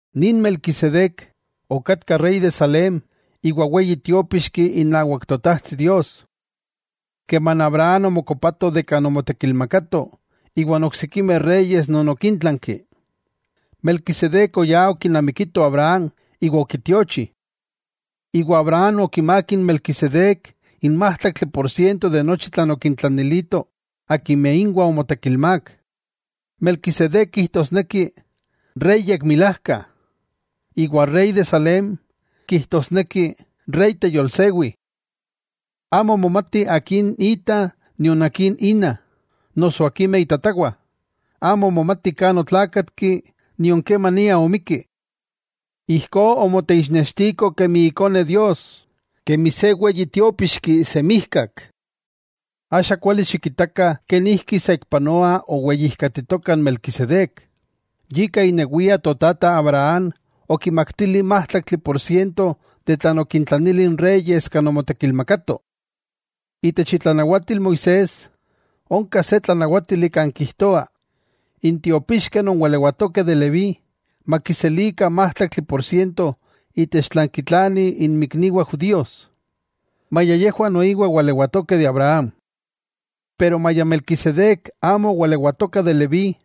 Nin Melquisedec, okatka rey de Salem iwa weyi tiópixki inawak Totajtsi Dios. Keman Abraham omokopato kan omotekilmakato iwan oksikimeh reyes non okintlanki, Melquisedec oyá okinamikito Abraham iwa okitiochi, iwa Abraham okimák n Melquisedec n májtlaktli por siento de nochi tlan okintlanilito akimeh inwah omotekilmák. Melquisedec kijtosneki “Rey yekmilajka”, iwa “Rey de Salem” kijtosneki “Rey teyolsewi”. Amo momati akin ita nion akin ina, noso akimeh itatawah, amo momati kan otlákatki nion kemania omikki. Ijkó omoteixnextiko kemi Ikone Dios, kemi se weyi tiópixki semijkak. Axa kuali xikitakah kenijki saikpanoa oweyijkatitoka n Melquisedec, yika inewia totata Abraham okimaktili májtlaktli por siento de tlan okintlanili n reyes kan omotekilmakato. Itech itlanawatil Moisés, onka se tlanawátili kan kijtoa, n tiopixkeh non walewatokeh de Leví makiselikah májtlaktli por siento itech tlan kitlanih inmikniwah judíos, maya yejwah noiwa walewatokeh de Abraham. Pero maya Melquisedec amo owalewatoka de Leví,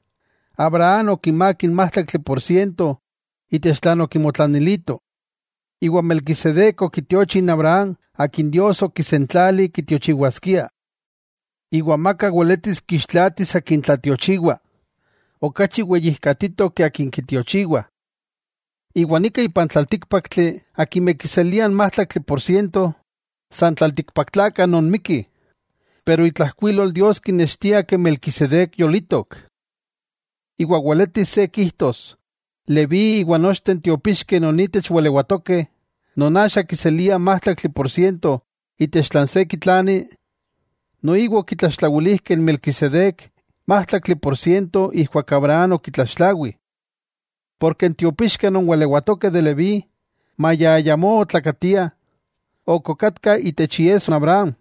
Abraham okimák n májtlaktli por siento itech tlan okimotlanilito. Melquisedec okitiochi Abraham akin Dios okisentlali kitiochiwaskia. Amaka weletis kixtlatis akin tlatiochiwa okachi weyijkatitok ke akin kitiochiwa. Iwa nika ipan tlaltíkpaktli akimeh kiseliah n májtlaktli por siento, san tlaltikpaktlakah non mikkih. Pero itlajkuilol Dios kinextiah ke Melquisedec yolitok. Iwa weletis se kijtos Leví iwa nochteh n tiopixkeh non itech walewatokeh, non axa kiseliah májtlaktli por siento itech tlan se kitlani, noiwa okitlaxtlawilijkeh n Melquisedec májtlaktli por siento ijkuak Abraham okitlaxtlawi. Porke n tiopixkeh non walewatokeh de Leví maya ayamó otlakatiah, ok okatkah itech iesso Abraham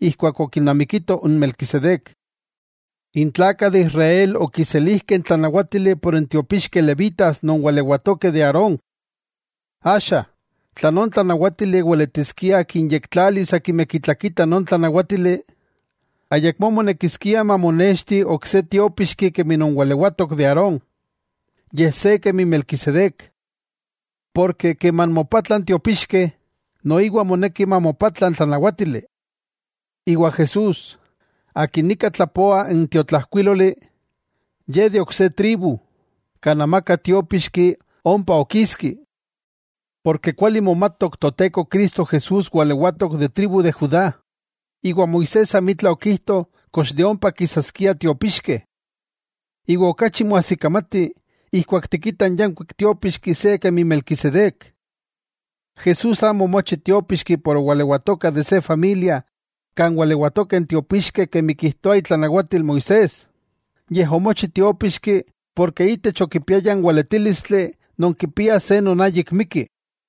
ijkuak okinamikito n Melquisedec. N tlakah de Israel okiselijkeh n tlanawátili por n tiopixkeh levitas non walewatokeh de Aarón. Axa, tla non tlanawátili weletiskia kinyektlalis akimeh kitlakitah non tlanawátili, ayakmó monekiskia mamonexti ok se tiópixki kemi non walewatok de Aarón, yej se kemi Melquisedec. Porke keman mopatla n tiopixkeh, noiwa moneki mamopatla n tlanawátili. Iwa Jesús, akin nika tlapoa n tiotlajkuíloli, Ye de ok se tribu, kan amaka tiópixki ompa okiski. Porke kuali momatok Toteko Cristo Jesús walewatok de tribu de Judá, iwa Moisés amitla okijto kox de ompa kisaskiah tiopixkeh. Iwa okachi moajsikamati ijkuak tikitah n yankuik tiópixki se kemi Melquisedec. Jesús amo omochi tiópixki por owalewatoka de se familia kan walewatokeh n tiopixkeh kemi kijtoa itlanawatil Moisés, yej omochi tiópixki porke itech okipiaya n weletílistli non kipia se non ayik mikki.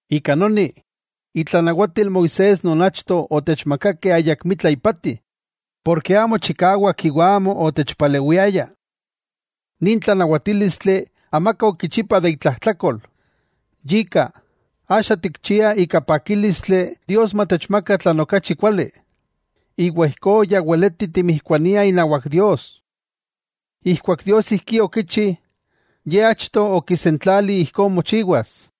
Ika noni, itlanawatil Moisés non achto otechmakakeh ayakmitla ipati, porke amo chikawak iwa amo otechpalewiaya. Nin tlanawatílistli amaka okichipa de itlajtlakol. Yika, axa tikchia ika pakílistli Dios matechmaka tlan okachi kuali, iwa ijkó ya weleti timijkuaniah inawak Dios. Ijkuak Dios ijkí okichi, Ye achto okisentlali ijkó mochiwas.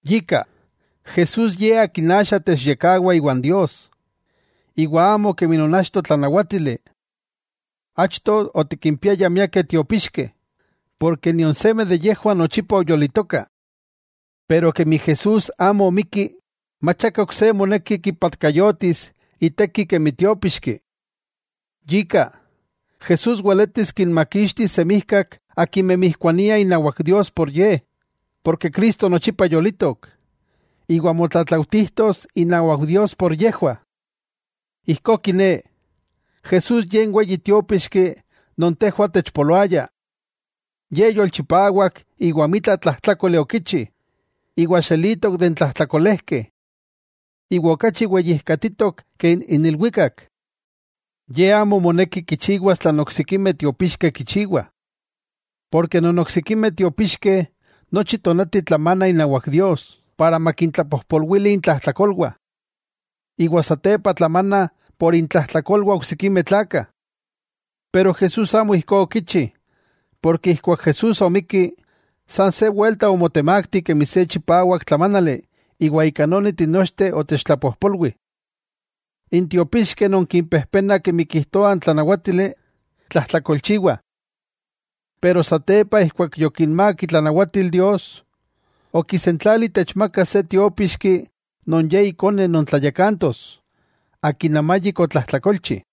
Yika, Jesús Ye akin axa techyekkawa iwan Dios, iwa amo kemi non achto tlanawátili. Achto otikimpiayah miakeh tiopíxkeh, porke nion seme de yejwah nochipa oyolitokah. Pero kemi Jesús amo mikki, mach aka ok se moneki kipatkayotis iteki kemi tiópixki. Yika, Jesús weletis kinmakixtis semijkak akimeh mijkuaniah inawak Dios por Ye, porke Cristo nochipa yolitok, iwa motlatlautijtos inawak Dios por yejwah. Ijkó kiné, Jesús Ye n Weyi Tiópixki non tejwah otechpoloaya. Ye yolchipawak iwa amitla tlajtlákoli okichi, iwa xelitok de n tlajtlakolejkeh. Iwa okachi weyijkatitok ke n ilwikak. Ye amo moneki kichiwas tlan oksikimeh tiopíxkeh kichiwah. Porke non oksikimeh tiopíxkeh nochi tonati tlamanah inawak Dios para makintlapojpolwili intlajtlakolwah. Iwa satepa tlamanah por intlajtlakolwah oksikimeh tlakah. Pero Jesús amo ijkó okichi, porke ijkuak Jesús omikki, san se welta omotemakti kemi se chipawak tlamánali iwa ika noni tinochteh otechtlapojpolwi. N tiopixkeh non kimpejpena kemi kijtoa n tlanawátili, tlajtlakolchiwah. Pero satepa ijkuak yokinmák itlanawatil Dios, okisentlali techmakas se tiópixki non Ye Ikone non tlayakantos, akin amayik otlajtlakolchi.